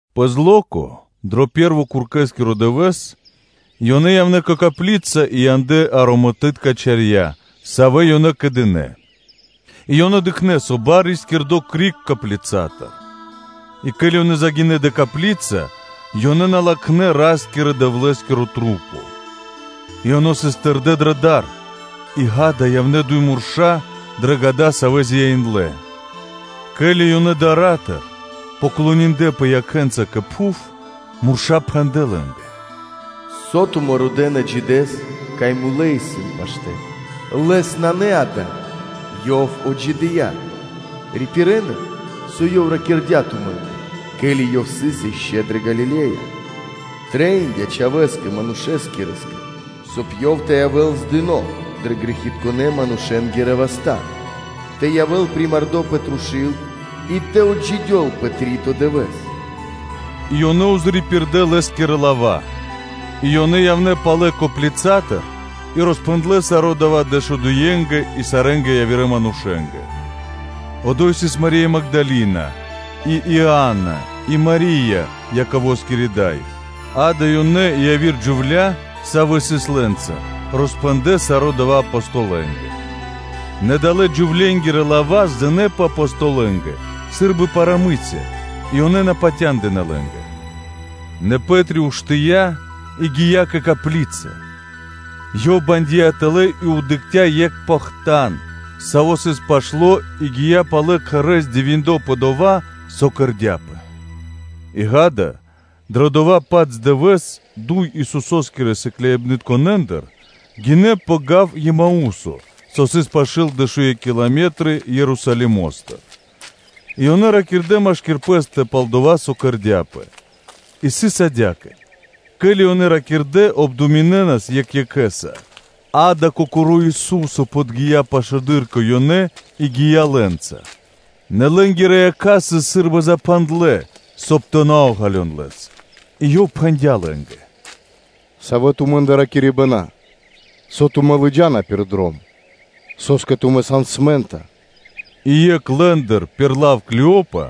Пэ зло́ко, дро пэ́рво куркэскиро дывэ́с, ёнэ явнэ́ кэ копли́ца и яндлэ́ ароматытка чарья́ тэ макхэн (тэ кхосэн), савэ́ ёнэ кэдынэ. И ёнэ дыкхнэ́, со бар сыс рискирдо криг коплицатыр. И ке́ли ёнэ загинэ́ дрэ копли́ца, ёнэ на латхнэ́ Ра́скирэ-Дэвлэ́скиро тру́по. И ёнэ сыс тэрдэ́ дрэ дар; и ґа́да, явнэ́ дуй мурша́ дрэ гада, савэ́ зяиндлэ. Ке́ли ёнэ дара́тыр поклониндлэпэ муенца кэ пхув, мурша́ пхэндлэ́ лэ́нгэ: “Со тумэ́ родэ́на Джидэс, кай мулэ́ исын паштэ́?” Лэс нанэ ада́й, Ёв отджидыя́: рипирэ́н, со Ёв ракирдя́ тумэ́нгэ, ке́ли Ёв сыс ишчо (инкэ́) дрэ Галиле́я: со Ёв пхэндя́: ‘Трэиндя́ Чхавэ́скэ Манушэскирэскэ, соб (кай) Ёв тэ явэ́л здыно дрэ грэхитконэ́-манушэ́нгирэ васта́, тэ явэ́л примардо пэ трушу́л, и тэ отджидёл пэ три́то дывэ́с.’” И ёнэ пририпирдэ Лэ́скирэ лава́; и ёнэ явнэ́ палэ коплицатыр и роспхэндлэ́ саро́ дава́ дэшуекхэнгэ и сарэ́нгэ явирэ манушэ́нгэ. Одо́й сыс Мари́я Магдалина и Иана и Мари́я, Яковоскири дай; ґа́да, ёнэ и яви́р джувля́, савэ́ сыс лэ́нца, роспхэндлэ́ саро́ дава́ Апостолэнгэ. Нэ далэ́-джувленгирэ лава́ здынэпэ Апостолэнгэ сы́рбы парамы́ся (сказка), и ёнэ на патяндынэ́ лэ́нгэ. Нэ Пэ́три уштыя́ и гия́ кэ копли́ца; ёв бандия тэлэ́ и дыкхця́ екх похтан, саво́ сыс пашто́ и гия́ палэ кхэрэ́ здивиндло пэ дова́, со кэрдя́пэ. И, ґа́да, дро дова́-паць дывэ́с дуй Исусо́скирэ сыкляибнытконэндыр джа́нас дро гав, Емаусо, со сыс пашы́л дэшуекх километры (эфта́ вэрсты) Ерусалимо́стыр; и ёнэ ракирдэ́ машки́р пэ́стэ пал дова́, со кэрдя́пэ. И сыс адя́кэ: ке́ли ёнэ ракирдэ́ и обдуминэнас екх екхэ́са, ґа́да, Кокоро́ Ису́со подги́я пашылэды́р кэ ёнэ и гия́ лэ́нца; нэ лэ́нгирэ якха́ сыс сы́рбы запхандлэ, соб (кай) тэ ґалён Лэс. И Ёв пхэндя́ лэ́нгэ: “Савэ тумэ́ндэ ракирибэна, со тумэ́ лыджа́на пир дром? Со́скэ тумэ́ сан смэнтна?” И екх лэ́ндыр пир лав Клеопа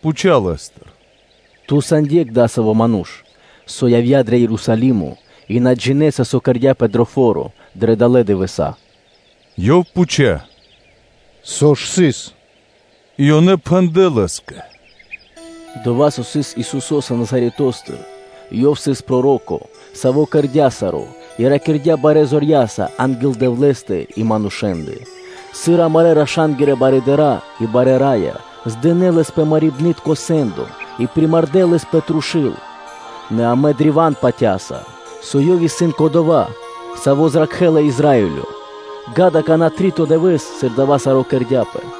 пхуця́ Лэ́стыр: “Ци ту сан екх дасаво ману́ш, со явдя́ дро Ерусалимо, и ту на джинэ́са, со кэрдя́пэ дро фо́ро дрэ далэ́ дывэса́?” Ёв пхуця́: “Со ж сыс?” И ёнэ пхэндлэ́ Лэ́скэ: “Дова́, со сыс Исусо́са Назаретостыр. Ёв сыс проро́ко, Саво́ кэрдя́ саро́ и ракирдя́ барэ́ зорья́са анги́л Дэвлэ́стэ и манушэ́ндэ; сыр амарэ́ раша́нгирэ барыдыра́ и барэ́ рая здынэ Лэс пэ мэрибнытко сэ́ндо и примардэ Лэс пэ трушу́л. Нэ амэ древа́н патя́са, со Ёв исын Кодова́, Саво́ зракхэ́ла Израиле; а кэ саро́ дава́, ґа́да, какана́ три́то дывэ́с, сыр дава́ саро́ кэрдя́пэ.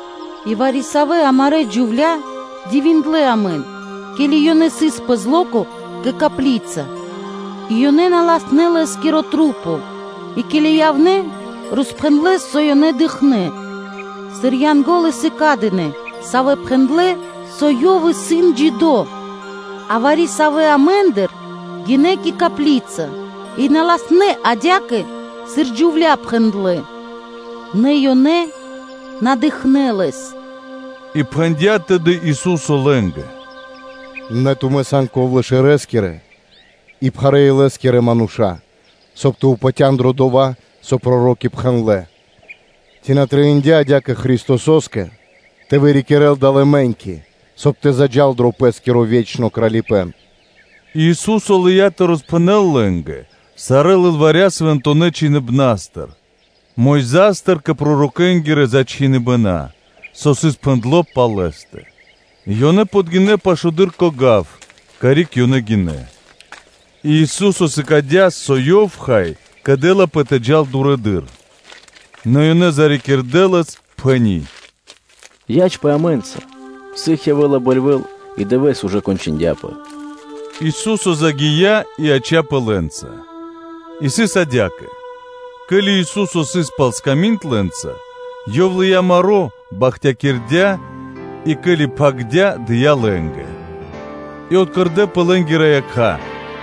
И вари-савэ́ амарэ́ джувля́ дивиндлэ амэн, ке́ли ёнэ сыс пэ зло́ко кэ копли́ца, и ёнэ на латхнэ́ Лэ́скиро тру́по, и, ке́ли явнэ́, роспхэндлэ́, со ёнэ дыкхнэ́, сыр Янго́лы сыкадынэ, савэ́ пхэндлэ́, со Ёв исын джидо́. А вари-савэ́ амэ́ндыр гинэ́ кэ копли́ца, и на латхнэ́ адя́кэ, сыр джувля́ пхэндлэ́, нэ ёнэ на дыкхнэ́ Лэс.” И пхэндя́ тэды Ису́со лэ́нгэ: “Нэ, тумэ́ сан бигодякирэ и пхарэ́-илэ́скирэ мануша́, соб (кай) тэ упатян дро дова́, со проро́ки пхэндлэ́! Ци на трэиндя́ адя́кэ тэ вырикирэл Христосо́скэ далэ́ мэ́ньки, соб (кай) тэ заджа́л дро Пэ́скиро ве́чно Кралипэ́н.” И Ису́со лыя́ тэ роспхэнэл лэ́нгэ сарэ́ лылваря Свэнтонэ́ Чхиныбна́стыр Мойзастыр кэ пророкэ́нгирэ зачхиныбэна, со сыс пхэндло́ пал Лэ́стэ. И ёнэ подгинэ́ пашылэды́р кэ гав, карик ёнэ гинэ́; и Ису́со сыкадя́, со Ёв, хай, кэдэлапэ тэ джал дурэды́р; Нэ ёнэ зарикирдэ Лэс, пхэни́: “Ячпэ амэ́нца, сыг явэ́ла бэльвэ́ль и дывэ́с ужэ кончындяпэ.” Ису́со загия́ и яця́пэ лэ́нца. И сыс адя́кэ: ке́ли Ису́со сыс пал сками́нд лэ́нца, Ёв лыя́ маро́, бахтякирдя́ и, ке́ли пхагирдя́, дыя́ лэ́нгэ. И откэрдэпэ лэ́нгирэ якха́,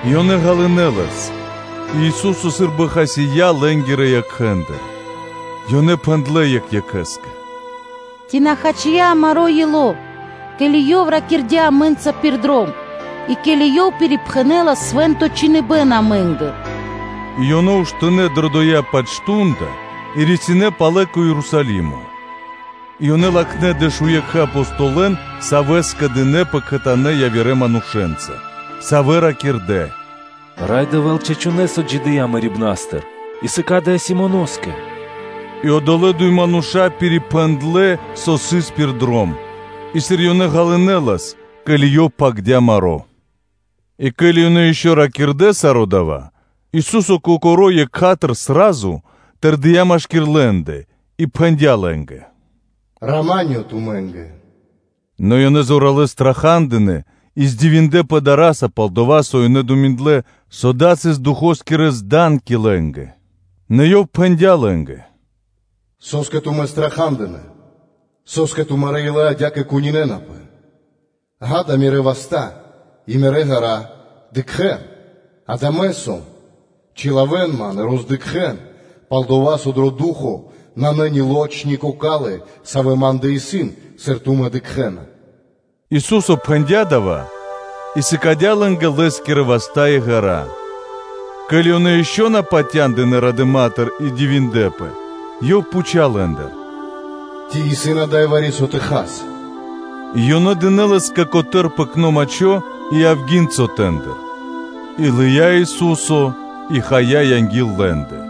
и ёнэ ґалынэ́ Лэс. И Ису́со сы́рбы хасия́ лэ́нгирэ якхэ́ндыр. Ёнэ пхэндлэ́ екх екхэ́скэ: “Ци на хачия амаро́ ило́, ке́ли Ёв ракирдя́ амэ́нца пир дром и, ке́ли Ёв пирипхэнэлас Свэ́нто Чхиныбэ́н (Писание́) амэ́нгэ?” И ёнэ уштынэ́ дрэ дова́-паць мардо́ (часо) и рисинэ́ палэ кэ Ерусалимо. И ёнэ латхнэ́ дэшуекхэ Апостолэн, савэ́ скэдынэ́пэ кхэтанэ́ явирэ манушэ́нца, савэ́ ракирдэ́: “Рай Дэвэ́л чачунэ́с отджидыя́ мэрибна́стыр и сыкадыя́ Симоноскэ.” И одолэ́ дуй мануша́ пирипхэндлэ, со сыс пир дром, и сыр ёнэ ґалынэ́ Лэс, ке́ли Ёв пхагирдя́ маро́. И ке́ли ёнэ ишчо (инкэ́) ракирдэ́ саро́ дава́, Ису́со Кокоро́ екха́тыр (сра́зу) тэрдия́, машки́р лэ́ндэ и пхэндя́ лэ́нгэ: ““Рама́нё (миро), тумэ́нгэ.” Нэ ёнэ зоралэ́с страха́дынэ и дивиндлэ́пэ дара́са, пал-дова́ со ёнэ думиндлэ, со дава́ сыс духо́скирэ зданки лэ́нгэ. Нэ Ёв пхэндя́ лэ́нгэ: “Со́скэ тумэ́ страха́дынэ? Со́скэ тумарэ́ илэ адя́кэ кунинэнапэ?” Акэ, Мирэ́ васта́ и Мирэ́ гэра, дыкхэ́н, ґа́да Мэ сом. Чилавэн Ман и роздыкхэн, пал-дова́ со дро ду́хо (фа́но) нанэ ни лоч, ни кокалы́, савэ́ Ма́ндэ исын, сыр тумэ́ дыкхэ́на.” Ису́со пхэндя́ дава́ и сыкадя́ лэ́нгэ Лэ́скирэ васта́ и ґэра́. Ке́ли ёнэ ишчо (инкэ́) на патяндынэ́ радыма́тыр и дивиндлэ́пэ, Ёв пхуця́ лэ́ндыр: “Ци исын ада́й вари-со тэ хас?” И ёнэ дынэ́ Лэ́скэ котэ́р пэкно мачхо, и авги́н сотэндыр. И лыя́ Ису́со и хая анги́л лэ́ндэ.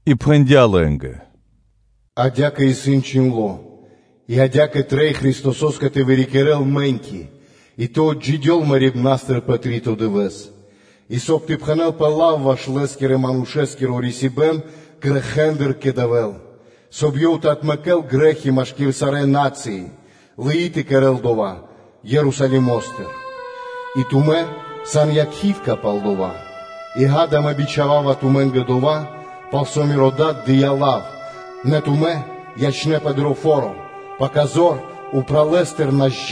и пхэндя́ лэ́нгэ: “Адя́кэ исын чхиндло́ и адя́кэ трэй Христосо́скэ тэ вырикирэл мэ́ньки, и тэ отджидёл мэрибна́стыр пэ три́то дывэ́с; и, соб (кай) тэ пхэнэлпэ лав ваш Лэ́скирэ-Манушэ́скиро рисибэн грэхэ́ндыр кэ Дэвэ́л, соб (кай) Ёв тэ отмэкэ́л грэ́хи машки́р сарэ́ на́цыи, лыи тэ кэрэ́л дава́ Ерусалимо́стыр. И тумэ́ сан якхи́тка (свидетели) пал дава́. И, ґа́да, Мэ бичхава́ва тумэ́нгэ дова́, пал со Миро Дад дыя́ лав; нэ тумэ́ ячэ́нпэ дро фо́ро, пака тумэ́ лэ́на зор упралэстыр.”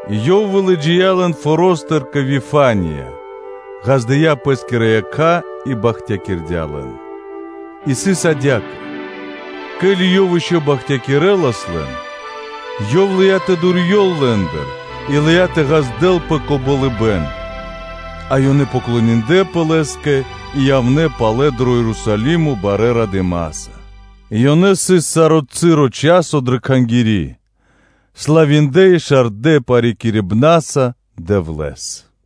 И Ёв вылыджия́ лэн форо́стыр кэ Вифания, ґаздыя́ Пэ́скирэ якха́ и бахтякирдя́ лэн. И сыс адя́кэ: ке́ли Ёв ишчо (инкэ́) бахтякирэлас лэн, Ёв лыя́ тэ дурьёл лэ́ндыр и лыя́ тэ ґаздэлпэ кэ болыбэ́н. А ёнэ поклониндлэпэ Лэ́скэ и явнэ́ палэ дро Ерусалимо барэ́ радыма́са, и ёнэ сыс саро́ часо дрэ Кхангири́, славиндлэ и шардэ парикирибнаса Дэвлэ́с. Ами́нь.